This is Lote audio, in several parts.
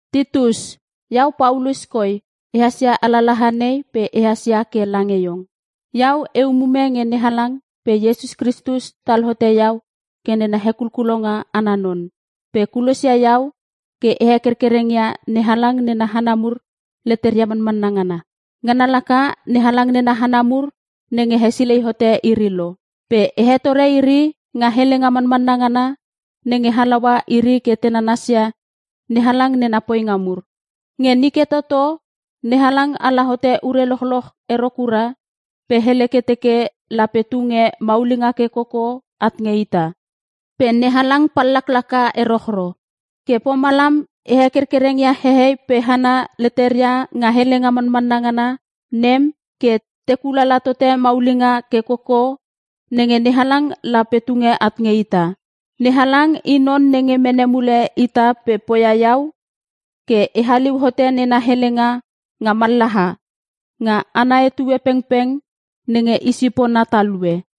Titus, iau Paulus koi ehas ia alalaha nei pe ehas ia ke lange iong. Iau e umume nge NeHalang pe Iesus Kristus tal hote iau ke nena hekulkulonga ana non. Pe kulosia iau ke e hekerkereng ia NeHalang nena hana mur leteria manmanna ngana. Ngana laka NeHalang nena hana mur nenge hesilei hote iri lo. Pe e hetore iri nga helenga manmanna ngana nenge halaua iri ke te nanasia NeHalang nena poinga mur. Nge nike toto NeHalang ala hote ure lochloch ero kura pe hele ke teke lape tunge maulinga ke koko at nge ita. Pe NeHalang pallaklaka erochro. Ke pomalam e hekerkereng ia hehei pe hana leteria nga helenga manmanna ngana nem, ke te kulala tote maulinga ke koko nenge NeHalang lape tunge at nge ita. NeHalang i non nenge mene mule ita pe poia iau ke e haliu hote nena helenga nga mallaha, nga ana etue pengpeng nenge i sipona talue.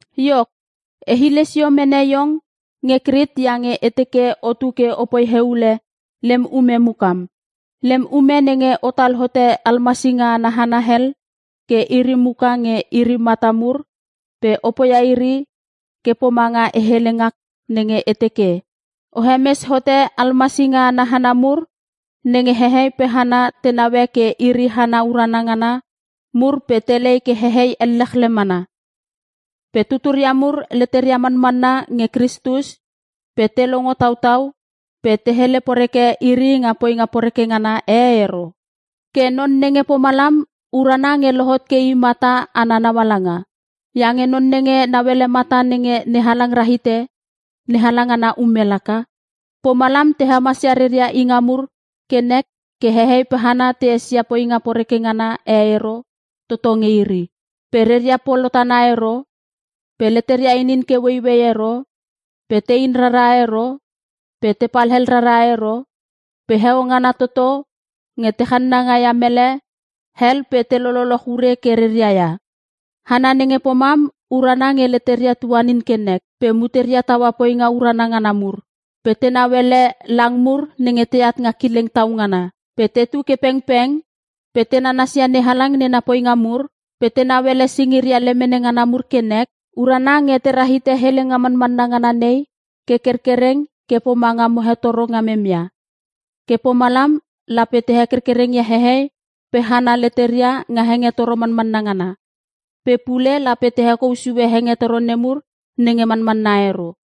Iok, e hile sio mene iong nge Krit iange e teke otu ke opoi heule lem ume mukam. Lem ume nenge otal hote almasinga ana hana hel ke iri muka nge iri mata mur pe o poia ke pomanga e hele ngak nenge e teke: O hemes hote almasinga ana hana mur nenge hehei pe hana te naue ke iri hana urana ngana mur pe telei ke hehei ellechle mana. Pe tuturia mur leteria manmanna nge Kristus pe te longo tautau pe te hele poreke iri nga poinga poreke ngana e ero. Ke non nenge pomalam urana nge lohot ke i mata ana naungaala. Iange non nenge nauele mata nenge NeHalang rahite NeHalang ana ume laka. Pomalam te hemasia reria inga mur ke nek ke hehei pe hana te esia poinga poreke ngana e ero toto nge iri. Pe reria polotana ero, pe leteria inin ke ueiuei ero, pe tein rara ero, pe tepal hel rara ero. Pe heo ngana toto nge te channanga ia mele hel pe te lololoch ure ke reria ia. Hana nenge pomam urana nge leteria tuanin ke nek, pe muteria taua poinga urana ngana mur, pe tenau ele lang mur nenge teat nga kileng tau ngana. Pe tetu ke pengpeng, pe te nanasia NeHalang nena poinga mur, pe tenau ele singiria lemene ngana mur ke nek. Urana nge tera hite helenga manmanna ngana nei ke kerkereng ke pomanga mo hetoro ngamem ia. Ke pomalam lape te hekerkereng ia hehei pe hana leteria nga hengetoro manmanna ngana. Pe pule lape te hekou sue hengetoro nemur nenge manmanna ero.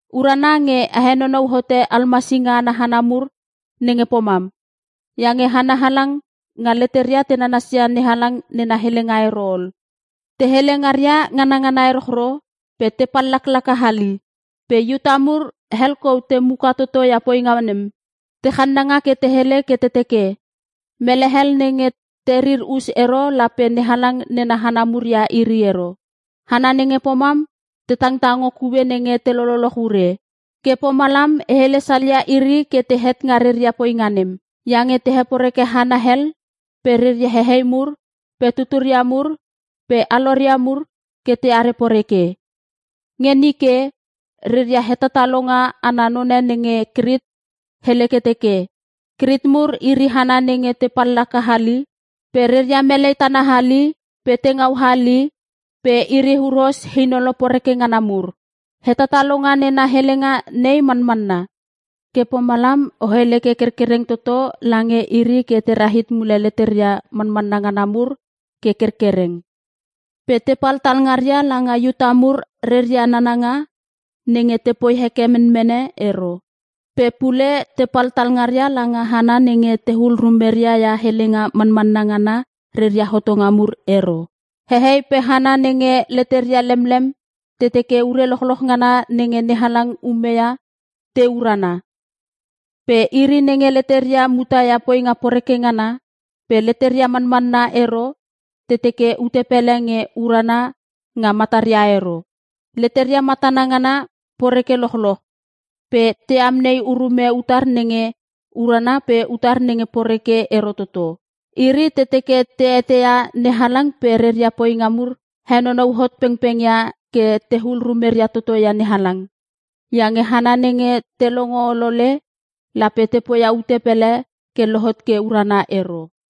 Urana nge o henonou hote almasinga ana hana mur nenge pomam. Iange hana halang nga letera te nanasia NeHalang nena helenga ero ol. Te hele ngaria ngana ngana erochro pe te pallaklaka hali. Pe Iuta mur hel kou te muka toto ia poinga nem. Te channanga ke te hele ke te teke, “Mele hel nenge terir us ero lape NeHalang nena hana mur ia iri ero!” Hana nenge pomam te tangtango kue nenge te lololoch ure. Ke pomalam a hele salia iri ke tehet nga reria poinga nem. Iange te heporeke hana hel pe reria hehei mur pe tuturia mur pe aloria mur ke teare poreke. Nge nike, reria hetatalonga ana none nge Krit hele ke teke, “Krit mur iri hana nenge te pallaka hali pe reria melei tana hali pe tengau hali pe iri huros inolo poreke ngana mur.” Hetatalonga nena helenga nei manmanna. Ke pomalam o hele ke kerkereng toto lange iri ke te rahit mule leteria manmanna ngana mur ke kerkereng, pe tepal talngaria langa Iuta mur reria nananga nenge tepoi heke menmene ero. Pe pule tepal talngaria langa hana nenge tehul rumeria ia helenga manmanna ngana reria hotonga mur ero. Hehei pe hana nenge leteria lemlem te teke ure lochloch ngana nenge NeHalang umeia te urana. Pe iri nenge leteria mutaia poinga poreke ngana pe leteria manmanna ero te teke ute pele nge urana nga mataria ero. Leteria matana ngana poreke lochloch pe te amnei urume utar nenge urana pe utar nenge poreke ero toto. Iri te teke te eteia NeHalang pe reria poinga mur henonou hot pengpengia ke tehul rumeria toto ia NeHalang, iange hana nenge te longo olole lape te poia ute pele ke lohot ke urana ero.